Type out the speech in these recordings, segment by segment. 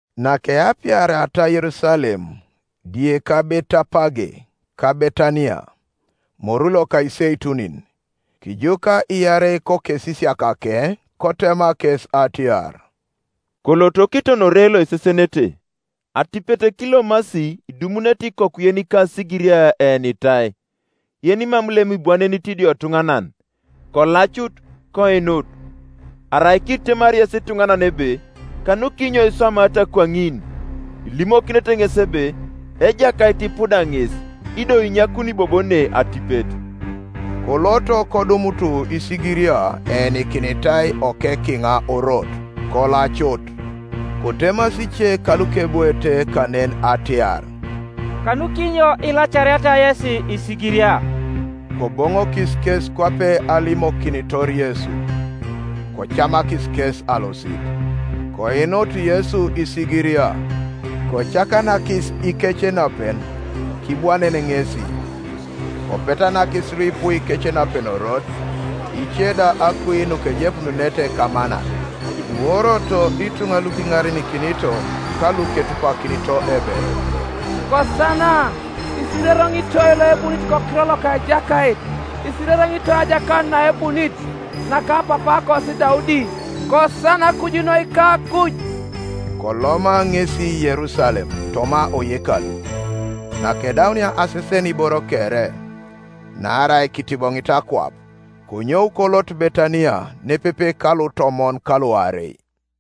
Nakeapiariata Yerusalem, die ka Betapage ka Betaniya, moru loka Iseitunin, kijuka iarei kokesisiakake, Kotema kes atiar, “Koloto kiton ore loisesenete: atipet kilomasi idumunete ikoku yenika asigiria eenitai, yenimam lem ibwanenit idiotuŋanan; kolacut, koinut. Arai kitemari yes ituŋanan ebe, ‘Kanukinyo iswamaata kwaŋin?’ ilimokinete ŋes ebe, ‘Ejakait ipuda ŋes, ido inyakuni bobo ne atipet.’” Koloto, kodumut isigiria eenikinitai okek kiŋa orot; kolacut. Kotemasi ice kalukebwoete kanen atiar, “Kanukinyo ilacariata yesi isigiria?” Koboŋokis kes kwape alimokinitor Yesu: kocamakis kes alosit. Koinut Yesu isigiria, kocakanakis ikecenapen; kibwanen ŋesi. Kopetanakis luipu ikecenapen orot; ice da akui nukejepununete kamanat. Kiworoto ituŋa lukiŋarenikinito ka luketupakinito ebe, “Kosana! Isirereŋitoi loebunit kokiror loka Ejakait! Isirereŋitoi ajakanut naebunit, naka papaakosi Daudi! Kosana kuju noi kakuj.” Koloma ŋesi Yerusalem, toma oyekalu; nakedaunia asesen iboro kere, naarai kitiboŋit akwap konyou kolot Betaniya nepepe kalutomon kaluarei.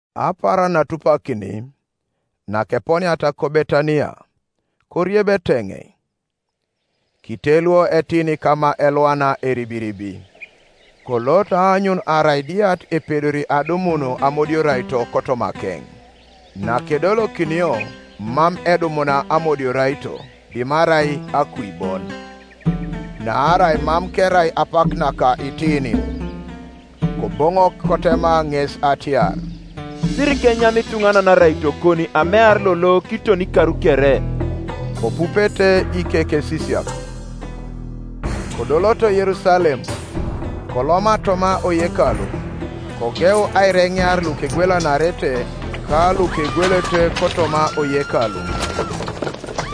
Apaaran naatupakini, nakeponiata ko Betaniya, korieb eteŋei. Kiteluo etini kama elwana eribiribi, kolot aanyun arai diat epedori adumun amodioraito kotomakeŋ; nakedolokinio mam edumuna amodioraito dimarai akui bon; naarai mam kerai apak naka itinin. Koboŋok kotema ŋes atiar, “Sirikenyam ituŋanan araitokon amear lolo kiton ikar kere.” Kopupete ikekesisiak. Kodoloto Yerusalem: koloma toma oyekalu, kogeu aireŋear lukegwelanarete ka lukegwelete kotoma oyekalu,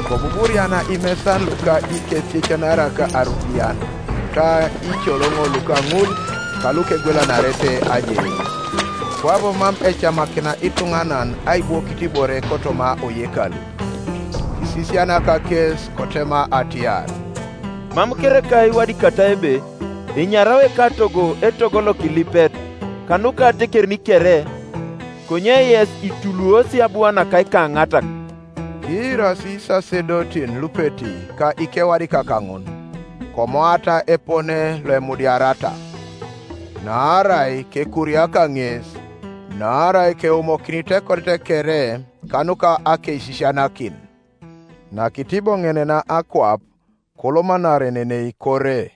kobuburiana imesan luka ikesiecanarak arupian ka iicoloŋo luka ŋul kalukegwelanarete ajeleik; kwabo mam ecamakina ituŋanan aibwokit ibore kotoma oyekalu. Kisisianak kes, kotema atiar, “Mam kereka iwadikatai ebe, ‘Enyarao ekatogo etogo lokilipet kanuka atekerin kere’? Konye yes ituluosi abua naka ikaŋatak.” Kiirasi isasedotin lupeti ka ikewadikak ŋun, komoata epone loemudiariata; naarai kekuriaka ŋes, naarai keumokinit ekodet kere kanuka akeisisianakin. Nakitiboŋenenaa akwap kolomanarenenei kore.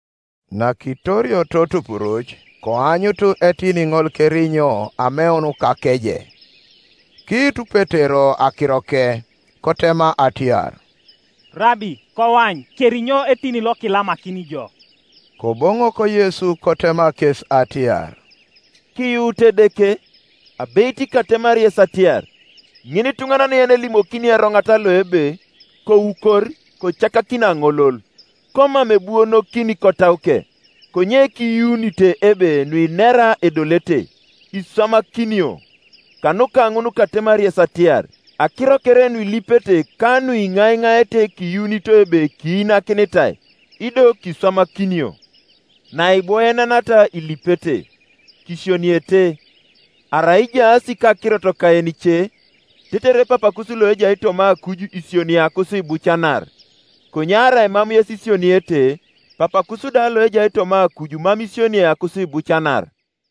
Nakitorioto tupuruc, koanyutu etini ŋol kerinyo ameun kakeje. Kiitu Petero akiroke, kotema atiar, “Rabi, koany, kerinyo etini lokilamakini ijo.” Koboŋok Yesu kotema kes atiar, “Kiyuutu Edeke. Abeit katemari yes atiar, Ŋinituŋanan yenelimokini eroŋat lo ebe, ‘Koukor, kocakakin aŋolol’; komam ebuonokini kotauke, konye kiyuunite ebe nuinera edolete; iswamakinio. Kanuka ŋun katemari yes atiar, Akiro kere nuilipete ka nuiŋaiŋaete kiyuunito ebe kiinakinitai, ido kiswamakinio. Naibwoenenaata ilipete, kisioniete, arai ijaas kakirot kayenice; tetere Papakus loejai toma akuj isioniei akusiibucanar. [ Konye arai mam yes isioniete, Papakus da loejai toma akuj mam isioniei akusiibucanar.]”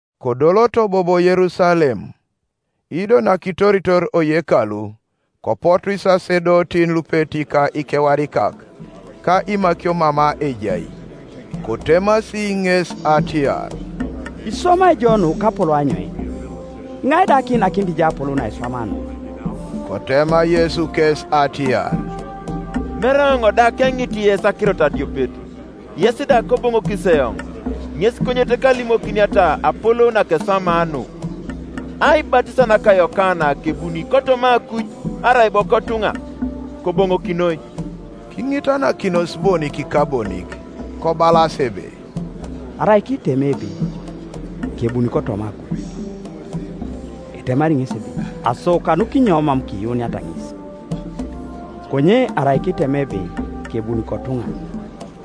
Kodoloto bobo Yerusalem: ido nakitoritor oyekalu, kopotu isasedotin lupeti ka ikewadikak ka imakio mama ejai; kotemasi ŋes atiar, “Iswamai ijo nu kapolou anyoin? Iŋai da kiinakini jo apolou nakiswamaa nu?” Kotema Yesu kes atiar, “Mere eoŋ da keŋit yes akirot adiopet, yes da koboŋokis eoŋ, ŋes konyet kalimokiniata apolou nakeswamaa nu. Aibatisa naka Yokana kebuni kotoma akuj, arai bo kotuŋa? Koboŋokinoi.” Kiŋitanakinos bonik ka bonik, kobalas ebe, “Arai kiitema ebe, ‘Kebuni kotoma akuj’; etemari ŋesi ebe, ‘Aso kanukinyo mam kiyuuniata ŋes?’ Konye arai kiitema ebe, ‘Kebuni kotuŋa’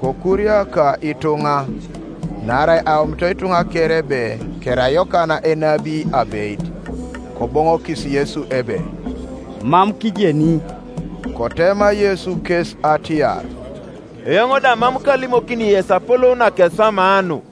kokuriaka ituŋa: naarai aomito ituŋa kere ebe kerai Yokana enabi abeit. Koboŋokis Yesu ebe, ‘Mam kijeni.’” Kotema Yesu kes atiar, “Eoŋ da mam kalimokini yes apolou nakeswamaa nu.”